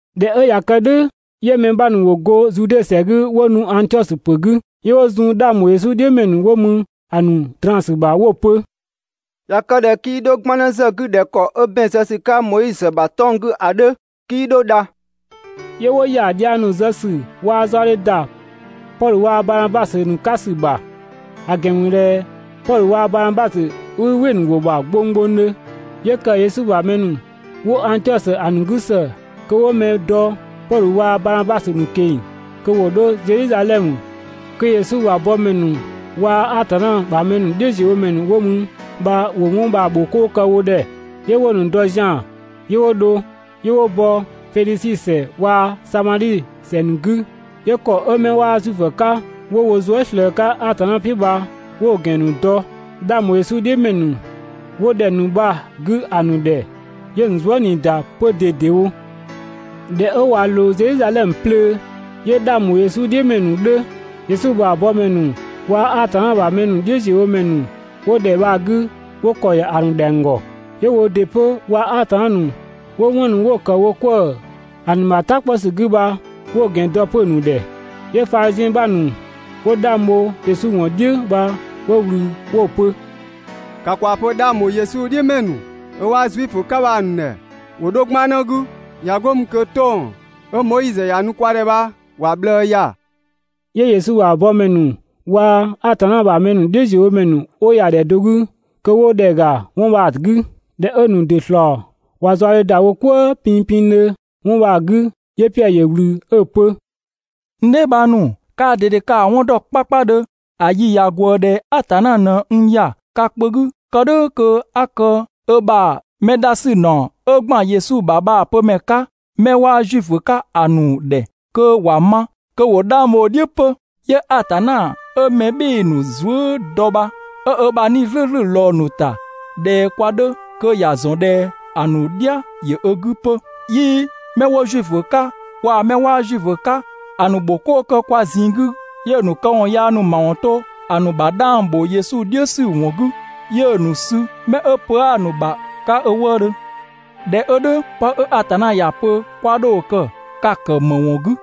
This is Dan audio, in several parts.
꞊Dhɛ 'ö ꞊ya kë "dhʋ̈, 'yö mɛ 'bha ‑nu ‑wo go Zude ‑sɛ 'gü 'wo nu Angtiɔsö ‑pö 'gü, 'yö 'wo zun 'dhang ‑bho Yesu "dhiʋ̈ ‑mɛ ‑nu 'wo mü ‑a ‑nu draan‑ ‑sü ‑bha 'wo‑ pö: «꞊Ya kë ꞊dhɛ 'kii 'dho 'gbannë ‑zë 'gü ꞊dhɛ ‑kɔ 'ö ‑bɛn zë ‑sü 'ka Moizö ‑bha 'tɔng‑ 'gü ‑a 'dhö, 'kii 'dho dha.» 'Yö 'wo ‑ya dhiang ‑nu zë ‑sü waa‑ zaɔdhe ‑da Pɔdhö waa‑ Banabasö ‑nu 'ka ‑sü ‑bha, ‑a ‑gɛn ‑mü ꞊dhɛ Pɔdhö waa‑ Banabasö 'wii "wɩ‑ ‑nu ‑wʋ ‑bha gbonggbongdhö. 'Yö ‑kë Yesu ‑bha mɛ ‑nu 'wo Angtiɔsö ‑a ‑nu 'gü ‑së kö 'wo mɛ dɔ Pɔdhö waa‑ Baanabasö ‑nu ꞊keng‑ kö ‑wo 'dho Zedhizadhɛmö kö Yesu ‑bha yëkëmɛ ‑nu waa‑ Atanna ‑bha mɛ ‑nu "dhiʋ̈ziöwomɛ ‑nu 'wo mü bha ‑wo 'wɔn bha‑ ‑bho 'koo kë wo ‑dhɛ. 'Yö 'wo‑ ‑nu dɔ zian‑ 'yö 'wo dho. 'Yö 'wo bɔ Fenisi ‑sɛ waa‑ Samadhi ‑sɛ ‑nu 'gü, 'yö ‑kɔ 'ö 'mɛ 'waa Zuifö 'ka 'wo wo zuë" ꞊slëë‑ 'ka Atanna "piʋ̈ bha, 'wo‑ ‑gɛn ‑nu dɔ 'dhang ‑bho Yesu "dhiʋ̈ ‑mɛ ‑nu 'wo ‑dhɛ ‑nu bha‑ 'gü ‑a ‑nu ‑dhɛ, 'yö‑ ‑nu zuë" ꞊nii ‑da 'pö ꞊dedewo. ꞊Dhɛ 'ö ꞊wa ꞊loo Zedhizadhɛmö 'plöö, 'yö 'dhang ‑bho Yesu "dhiʋ̈ ‑mɛ ‑nu 'dhö, Yesu ‑bha yëkëmɛ ‑nu waa‑ Atanna ‑bha ‑mɛ ‑nu "dhiʋ̈ziöwomɛ ‑nu 'wo ‑dhɛ bha‑ 'gü 'wo ‑kɔ ‑ya ‑a ‑nu ‑dhɛng ‑gɔ, 'yö woo ‑dɩ 'pö waa‑ Atanna ‑nu 'wo 'wɔn ‑nu 'wo‑ ‑kë wo 'kwëë‑ ‑a ‑nu ‑bha "ta 'kpɔ ‑sü 'gü bha 'wo‑ ‑gɛn dɔ 'pö‑ ‑nu ‑dhɛ. 'Yö Fadhiziɛn ‑nu 'bha ‑nu 'wo 'dhang bho Yesu ‑wɔn "dhiʋ̈ bha 'wo ꞊wlü 'wo‑ pö: «‑Ka ‑kwaa pö 'dhang ‑bho Yesu "dhiʋ̈ ‑mɛ ‑nu 'ö 'waa Zuifö 'ka bha‑ ‑nu ‑dhɛ ‑wo 'dho 'gbannë 'gü, ꞊ya 'go mü kö 'tɔng‑ 'ö Moizö ‑ya nu kwa ‑dhɛ bha ‑wa ꞊bhlëë ‑ya. 'Yö Yesu ‑bha yëkëmɛ ‑nu waa‑ Atanna ‑bha mɛ ‑nu "dhiʋ̈ziöwomɛ ‑nu 'wo ‑ya ‑dhɛ do 'gü kö 'wo ‑dhɛ ‑ga 'wɔn bha‑ 'gü. ꞊Dhɛ 'ö‑ ‑nu ‑dɩ ‑slɔɔ ꞊wa zaɔdhe ‑da wo "kwëë pinpindhö 'wɔn bha‑ 'gü, 'yö Piɛdhö ‑yö ꞊wlü 'ö‑ pö: «N dheebhang ‑nu, kaa ꞊dede ka‑ 'wɔn ‑dɔ 'kpakpadhö ‑a yi ꞊ya ꞊gwëë ‑dhɛ Atanna ꞊në n ‑ya ka kpö 'gü kë "dhʋ̈ kö 'a kë ö ‑bha mɛ dha ‑sü ‑naɔ 'ö ‑gban Yesu ‑bha bha‑ pömɛ 'ka 'mɛ 'waa Zuifö 'ka ‑a ‑nu ‑dhɛ kö ‑wa ma kö ‑wo 'dhang bho‑ "dhiʋ̈ 'pö. 'Yö Atanna 'ö mɛ "bhɩɩ‑ ‑nu zuë" dɔ bha 'ö ö ‑bha 'Nii‑ "slʋ̈ʋ̈slʋ̈ ꞊lɔɔ‑ ‑nu ‑ta ꞊dhɛ kwa 'dhö kö ‑ya ‑zɔn ꞊dhɛ ‑a ‑nu "dhia ‑yö ö 'gü 'pö. 'Yii 'mɛ 'wo Zuifö 'ka waa‑ 'mɛ 'waa Zuifö 'ka ‑a ‑nu ‑bho 'koo kë kwa ꞊zinng 'gü. 'Yö‑ ‑nu këwɔn yaa ‑nu ‑mawɔn to‑ ‑nu ‑bha 'dhang ‑bho Yesu "dhiʋ̈ ‑sü ‑wɔn 'gü, 'yö‑ ‑nu sü 'mɛ 'ö pö 'aa‑ ‑nu ‑bha 'ka ö wëëdhö. ꞊Dhɛ 'ö "dhʋ̈, 'pë 'ö Atanna ‑ya pö 'kwa 'dho‑ kë ka‑ ‑kë ‑më ‑wɔn 'gü?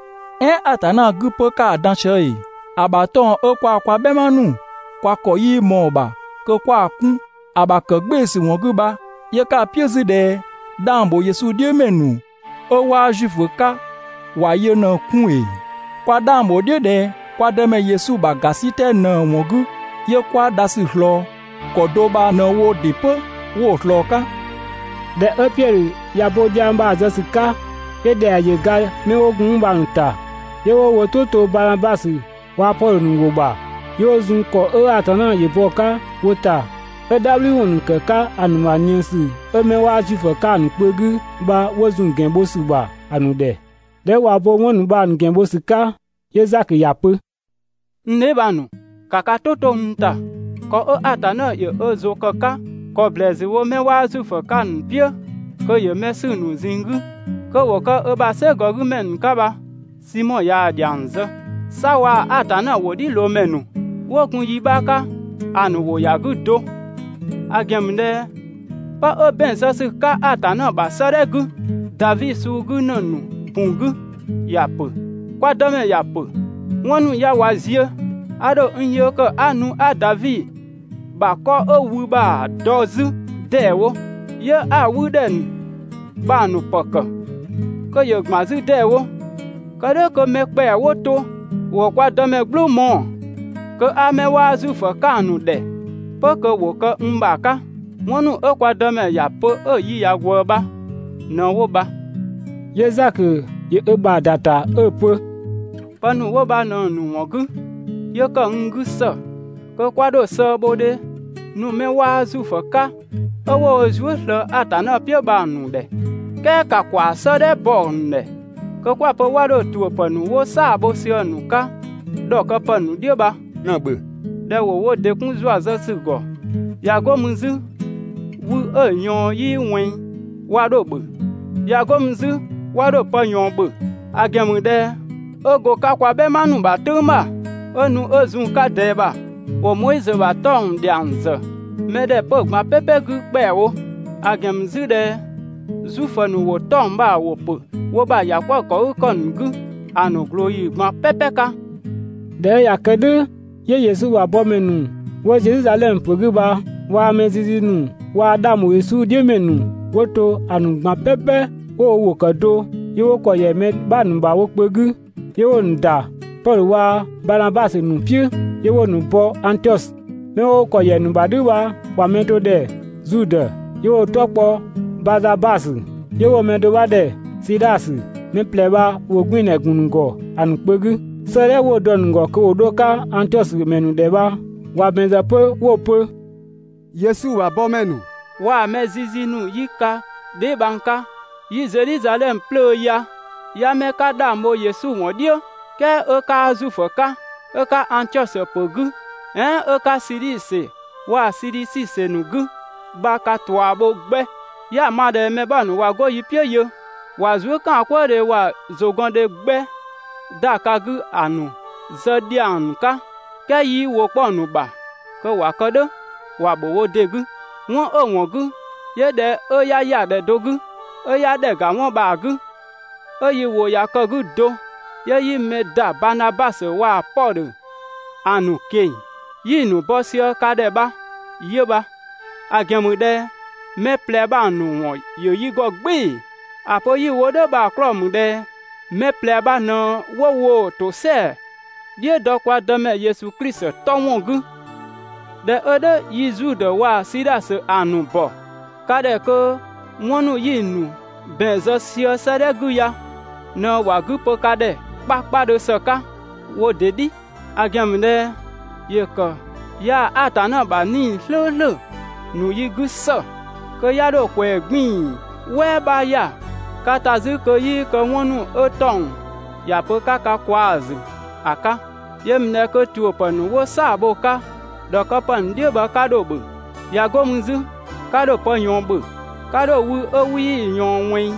"Ɛɛn Atanna 'gü 'pö 'ka‑ dan sië ‑ee? ‑A ‑bha 'tɔng‑ 'ö kwaa kwa "bhɛma ‑nu kwa ‑kɔ 'yii ꞊mɔɔ‑ ‑bha kö 'kwa‑ 'kun ‑a ‑bha ‑kë "gbɩɩ‑ ‑sü ‑wɔn 'gü bha 'yö 'ka‑ "piʋ̈ 'zü ꞊dhɛ 'dhang ‑bho Yesu "dhiʋ̈ ‑mɛ ‑nu 'ö 'waa Zuifö 'ka ‑wa yö ꞊në‑ 'kun ‑ee? Kwa 'dhang ‑bho "dhiʋ̈ ꞊dhɛ kwa Dëmɛ Yesu ‑bha ‑gasitɛ ꞊në‑ ‑wɔn 'gü 'yö 'kwa dhasü ꞊slɔɔ. ‑Kɔ do bha ꞊në woo‑ ‑dɩ 'pö 'wo‑ ꞊slɔɔ‑ 'ka.» ꞊Dhɛ 'ö Piɛdhö ꞊ya bo dhiang bha‑ zë ‑sü 'ka, 'yö ‑dhɛa ‑yö ga 'mɛ 'wo gun 'mü bha‑ ‑nu ‑ta. 'Yö 'wo wo "tʋ to Banabasö waa‑ Pɔdhö ‑nu ‑wʋ ‑bha, 'yö 'wo zun ‑kɔ 'ö Atanna ‑yö bɔ‑ 'ka wo ‑ta 'ö "dhabhliwɔn ‑nu ‑kë 'ka ‑a ‑nu ‑bha ꞊nië ‑sü 'ö 'mɛ 'waa Zuifö 'ka‑ ‑nu kpö 'gü bha 'wo zun‑ ‑gɛn bho ‑sü ‑bha ‑a ‑nu ‑dhɛ. ꞊Dhɛ 'ö ꞊wa bo 'wɔn ‑nu bha‑ ‑nu ‑gɛn bho ‑sü 'ka 'yö Zakö ‑ya pö: «N dheebhang ‑nu, ‑ka ka "tʋ 'to n ‑ta! ‑Kɔ 'ö Atanna ‑yö ö ‑zʋ ‑kë 'ka ‑kɔ ‑blɛɛsü wo 'mɛ 'waa Zuifö 'ka‑ ‑nu "piʋ̈ kö ‑yö mɛ 'sü‑ ‑nu ꞊zinng 'gü kö ‑wo kë ö ‑bha "sɛgɔ 'gümɛ ‑nu 'ka bha, Simɔ ꞊yaa‑ ‑dhiang zë. 'Sa waa‑ Atanna ‑wʋdhiʋ̈loomɛ ‑nu 'wo gun yi 'bha 'ka ‑a ‑nu ‑wʋ ‑ya 'gü do, ‑a ‑gɛn ‑mü ꞊dhɛ 'pë 'ö ‑bɛn zë ‑sü 'ka Atanna ‑bha 'sëëdhɛ 'gü Davi suu 'gü ‑në ‑nu ‑bu 'gü ‑ya ‑pö: ‹Kwa Dëmɛ ‑ya pö: 'Wɔn ‑nu ya ꞊wa ziö, a ‑dho n yee kë 'a nu 'a Davi ‑bha 'kɔ 'ö wü bha‑ dɔ 'zü ‑deewo, 'yö 'a‑ 'wü ‑dhɛ ‑nu bha‑ ‑nu ‑pë ‑kë kö ‑yö ‑gban 'zü ‑deewo. Kë "dhʋ̈ kö mɛ ‑kpɛa 'wo to ‑wo kwa Dëmɛ "gblʋʋ mɔɔ‑, kö 'a 'mɛ 'waa Zuifö 'ka‑ ‑nu ‑dhɛ 'pö kö ‑wo kë n ‑bha 'ka›.» 'Wɔn ‑nu 'ö kwa Dëmɛ ‑ya pö 'ö‑ yi ꞊ya ꞊gwëë bha ꞊në 'wo bha.» 'Yö Zakö ‑yö ö ‑bha ‑da ‑ta 'ö‑ pö: «Pë ‑nu 'wo bha ꞊në‑ ‑nu ‑wɔn 'gü 'yö ‑kë n 'gü ‑së kö 'kwa 'dho sëëbhodhe nu 'mɛ 'waa Zuifö 'ka 'ö 'wo wo zuë" ꞊slëë Atanna "piʋ̈ bha‑ ‑nu ‑dhɛ! "Kɛɛ ‑ka ‑kwa 'sëëdhɛ bɔ‑ ‑nu ‑dhɛ kö 'kwa‑ pö 'wa 'dho ‑tuʋ̈pë ‑nu 'wo "saa‑ bho sië‑ 'ka ‑dhɔkëpë ‑nu "dhiʋ̈ bha ꞊në‑ ‑bhö! ꞊Dhɛ ‑wo wo ‑dɩ 'kun ‑zua zë ‑sü ‑gɔ, ꞊ya 'go mü 'zü wü 'ö‑ ꞊yɔɔn 'yii ꞊wɛnng 'wa 'dho‑ ‑bhö. ꞊Ya 'go mü 'zü 'wa 'dho pë ꞊yɔɔn ‑bhö, ‑a ‑gɛn ‑mü ꞊dhɛ 'ö go‑ 'ka kwa "bhɛma ‑nu ‑bha "tʋ̈ng ‑bha 'ö nu 'ö zun‑ 'ka ꞊dɛɛ ‑bha, ‑wo Moizö ‑bha 'tɔng‑ ‑wɔn dhiang ‑zë mɛ ‑dhɛ 'pö‑ ꞊gban "pɛpɛ 'gü ‑kpɛawo; ‑a ‑gɛn ‑mü 'zü ꞊dhɛ Zuifö ‑nu ‑wo 'tɔng‑ bha‑ ‑wʋ ‑pö wo ‑bha ‑yakwëëkëgükɔ ‑nu 'gü ‑a ‑nu ꞊glooyi ꞊gban "pɛpɛ 'ka. ꞊Dhɛ 'ö ꞊ya kë "dhʋ̈ 'yö Yesu ‑bha yëkëmɛ ‑nu 'wo Zedhizadhɛmö ‑pö 'gü bha waa‑ mɛ zizi ‑nu waa‑ 'dhang ‑bho Yesu "dhiʋ̈ ‑mɛ ‑nu 'wo to ‑a ‑nu ꞊gban "pɛpɛ 'wo wo ‑wʋ ‑kë do 'yö 'wo ‑kɔ ‑yɛ mɛ 'bha ‑nu ‑bha wo kpö 'gü, 'yö 'wo‑ ‑nu ‑da Pɔdhö waa‑ Banabasö ‑nu "piʋ̈, 'yö 'wo‑ ‑nu bɔ Angtiɔsö. 'Mɛ 'wo ‑kɔ ‑yɛ ‑nu ‑bha "dhʋ̈ bha ‑wa mɛ do ‑dhɛ Zudë, 'yö 'wo‑ 'tɔ kpɔ Bazabasö, 'yö 'wo‑ mɛ do 'bha ‑dhɛ Sidhasö. Mɛ ꞊plɛ bha ‑wʋgbiindhɛ ‑gun ‑nu ‑gɔ ‑a ‑nu kpö 'gü. 'Sëëdhɛ 'wo‑ dɔ‑ ‑nu ‑gɔ kö ‑wo 'dho‑ 'ka Angtiɔsö ‑mɛ ‑nu ‑dhɛ bha ‑wa ‑bɛn ‑zë 'pö 'wo‑ pö: «Yesu ‑bha yëkëmɛ ‑nu waa‑ mɛ zizi ‑nu 'yi ka dheebhang 'ka 'yi Zedhizadhɛmö 'plöö ya, 'ya 'mɛ 'ka 'dhang bho Yesu ‑wɔn "dhiʋ̈ "kɛɛ 'ö 'kaa Zuifö 'ka, 'ö 'ka Angtiɔsö ‑pö 'gü "ɛɛn 'ö 'ka Siidhi ‑sɛ waa‑ Sidhisi ‑sɛ ‑nu 'gü bha ka ꞊tua bho 'gbɛ. 'Ya‑ ma ꞊dhɛ mɛ 'bha ‑nu ꞊wa 'go yi "piʋ̈ yö ꞊wa zuëkaankwëëdhe waa‑ ‑zʋgɔndhe 'gbɛ ‑da ka 'gü ‑a ‑nu zë ‑dhiang ‑nu 'ka, "kɛɛ 'yii ‑wʋ 'kpɔ‑ ‑nu ‑bha kö ‑wa kë "dhʋ̈ (‑wa ‑bho wo ‑dɩ 'gü). 'Wɔn 'ö‑ ‑wɔn 'gü 'yö ꞊dhɛ 'ö 'ya ‑ya ‑dhɛ do 'gü 'ö 'ya ‑dhɛ ‑ga 'wɔn bha‑ 'gü, 'ö yi ‑wʋ ꞊ya kë‑ 'gü do 'yö 'yi mɛ ‑da Baanabasö waa‑ Pɔdhö ‑a ‑nu ꞊keng‑ 'yi‑ ‑nu bɔ sië ka ‑dhɛ bha 'yö bha, ‑a ‑gɛn ‑mü ꞊dhɛ mɛ ꞊plɛ bha‑ ‑nu ‑wɔn ‑yö yi ‑gɔ "gbɩɩ‑. ‑A pö 'yi‑ wo "dhʋ̈ bha‑ 'klɔɔ‑ ‑mü ꞊dhɛ mɛ ꞊plɛ bha ꞊në 'wo woo‑ ‑tosɛa "dhiʋ̈ dɔ kwa Dëmɛ Yesu Klisi 'tɔ ‑wɔn 'gü. ꞊Dhɛ 'ö "dhʋ̈ yi Zudë waa‑ Sidhasö ‑a ‑nu ‑bɔ ka ‑dhɛ kö 'wɔn ‑nu 'yi‑ ‑nu ‑bɛn zë sië 'sëëdhɛ 'gü ya ꞊në ‑wa 'gü pö ka ‑dhɛ 'kpakpadhö ‑së 'ka wo ‑dɩ "dhi. ‑A ‑gɛn ‑mü ꞊dhɛ ‑yö ‑kë yaa‑ Atanna ‑bha 'Nii‑ "slʋ̈ʋ̈slʋ̈ ‑nu yi 'gü ‑së kö 'ya 'dho ꞊kwɛɛ‑ 'gbiin‑ "wɛɛ 'bha ‑ya ka ‑ta 'zü kö 'yii kë 'wɔn ‑nu 'ö 'tɔng‑ ‑ya pö 'ka ka kwaa‑ ‑zü ‑a 'ka. Yö ‑mü ꞊dhɛ kö ‑tuʋ̈pë ‑nu 'wo "saa‑ bho‑ 'ka ‑dhɔkëpë ‑nu "dhiʋ̈ bha 'ka 'dho‑ ‑bhö. ꞊Ya 'go mü 'zü 'ka 'dho pë ꞊yɔɔn ‑bhö. 'Ka 'dho wü 'ö 'wii‑ ꞊yɔɔn ꞊wɛnng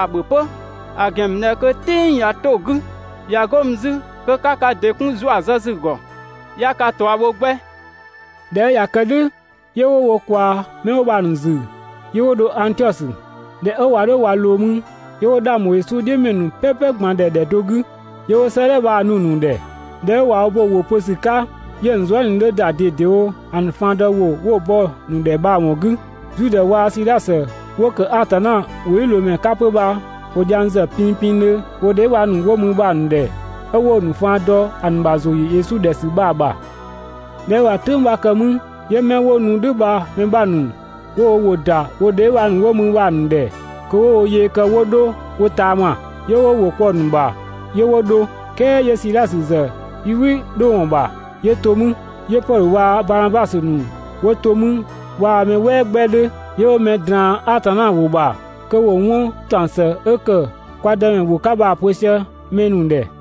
‑a ‑bhö 'pö, ‑a ‑gɛn ‑mü ꞊dhɛ kö‑ "tɩng ꞊ya 'to‑ 'gü, ꞊ya 'go mü 'zü kö 'ka ka ‑dɩ 'kun ‑zua zë ‑sü ‑gɔ. 'Ya ka ꞊tua bho 'gbɛ» ꞊Dhɛ 'ö ꞊ya kë "dhʋ̈, 'yö 'wo wo ꞊kwaa 'mɛ 'wo bha‑ ‑nu ‑zü 'yö 'wo dho Angtiɔsö. ꞊Dhɛ 'ö ꞊wa 'dho ꞊wa ꞊loo mü 'yö 'wo 'dhang ‑bho Yesu "dhiʋ̈ ‑mɛ ‑nu "pɛpɛ ꞊gban ‑dhɛ ‑dhɛ do 'gü, 'yö 'wo 'sëëdhɛ bha‑ nu‑ ‑nu ‑dhɛ. ꞊Dhɛ 'ö ꞊wa bo‑ ‑wʋ pö ‑sü 'ka, 'yö‑ ‑nu zuë" ꞊nii 'dhö ‑da ꞊dedewo ‑a ‑nu faan dɔ ‑wʋ 'wo‑ bɔ‑ ‑nu ‑dhɛ bha‑ ‑wɔn 'gü. Zudë waa‑ Sidhasö 'wo ‑kë Atanna ‑wʋdhiʋ̈loomɛ 'ka 'pö bha ‑wo dhiang ‑zë pinngdhö wo dheebhang ‑nu 'wo mü bha‑ ‑nu ‑dhɛ, 'ö 'wo‑ ‑nu faan dɔ ‑a ‑nu ‑bha ‑zʋ ‑yö Yesu ‑dhɛ ‑sü bha‑ ‑bha. ꞊Dhɛ 'ö ꞊wa "tʋ̈ng 'bha kë 'mü, 'yö 'mɛ 'wo nu "dhʋ̈ bha‑ mɛ 'bha ‑nu 'wo wo ‑wʋ ‑da wo dheebhang ‑nu 'wo mü bha‑ ‑nu ‑dhɛ kö 'wo wo yee kë 'wo 'dho wo ꞊taama. 'Yö 'wo wo ‑wʋ kpɔ‑ ‑nu ‑bha 'yö 'wo dho. "Kɛɛ 'yö Sidhasö ‑zë 'yii "wɩ 'dho ‑wɔn ‑bha, 'yö to mü. 'Yö Pɔdhö waa‑ Baanabasö ‑nu 'wo to mü waa‑ mɛ "wɛɛ 'gbɛ 'dhö, 'yö 'wo mɛ ꞊draan‑ Atanna ‑wʋ ‑bha, kö ‑wo 'wɔn ‑taɔng ‑së 'ö ‑kë kwa Dëmɛ ‑wʋ 'ka bha‑ pö sië mɛ ‑nu ‑dhɛ.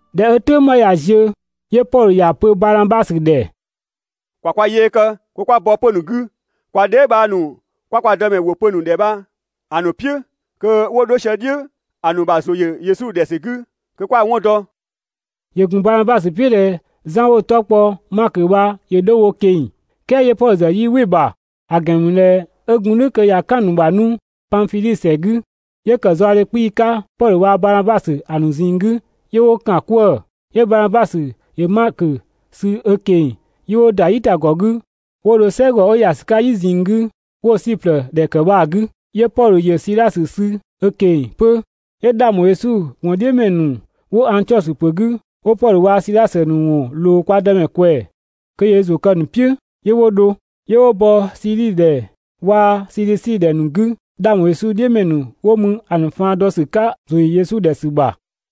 ꞊Dhɛ 'ö "tʋ̈ng 'bha ꞊ya ziö, 'yö Pɔdhö ‑ya pö Banabasö ‑dhɛ: «‑Kwa kwa yee kë 'kwa bɔ 'pö‑ ‑nu 'gü, kwa dheebhang ‑nu 'kwa kwa Dëmɛ ‑wʋ pö‑ ‑nu ‑dhɛ bha‑ ‑nu "piʋ̈ kö 'wo 'dho sië "dhiʋ̈ ‑a ‑nu ‑bha ‑zʋ ‑yö Yesu ‑dhɛ ‑sü 'gü kö 'kwa‑ 'wɔn dɔ!» ‑Yö ‑gun Banabasö "piʋ̈ ꞊dhɛ Zan 'wo‑ 'tɔ kpɔ Makö bha ‑yö 'dho wo ꞊keng‑, "kɛɛ 'yö Pɔdhö ‑zë 'yii "wɩ‑ ‑bha; ‑a ‑gɛn ‑mü ꞊dhɛ 'ö gun "dhʋ̈ kö ꞊ya "kan‑ ‑nu ‑bha 'nu Panfidhi ‑sɛ 'gü. 'Yö ‑kë zaɔdhe 'kpii‑ 'ka Pɔdhö waa‑ Banabasö ‑a ‑nu ꞊zinng 'gü 'yö 'wo ‑kan 'kwëë‑. 'Yö Banabasö ‑yö Makö sü ö ꞊keng‑ 'yö 'wo ‑da "yitagɔ 'gü 'wo dho "sɛgɔ 'ö ‑ya ‑sü 'ka "yi ꞊zinng 'gü 'wo‑ Siplë ‑dhɛ ‑kë bha‑ 'gü. 'Yö Pɔdhö ‑yö Sidhasö sü ö ꞊keng‑ 'pö. 'Yö 'dhang ‑bho Yesu ‑wɔn "dhiʋ̈ ‑mɛ ‑nu 'wo Angtiɔsö ‑pö 'gü 'wo Pɔdhö waa‑ Sidhasö ‑nu ‑wɔn ꞊loo kwa Dëmɛ ꞊kwɛɛ‑ kö ‑yö ö ‑zʋ kë‑ ‑nu "piʋ̈ 'yö 'wo dho. 'Yö 'wo bɔ Siidhi ‑dhɛ waa‑ Sidhisi ‑dhɛ ‑nu 'gü 'dhang ‑bho Yesu "dhiʋ̈ ‑mɛ ‑nu 'wo mü ‑a ‑nu faan dɔ ‑sü 'ka ‑zʋ ‑yö Yesu ‑dhɛ ‑sü ‑bha.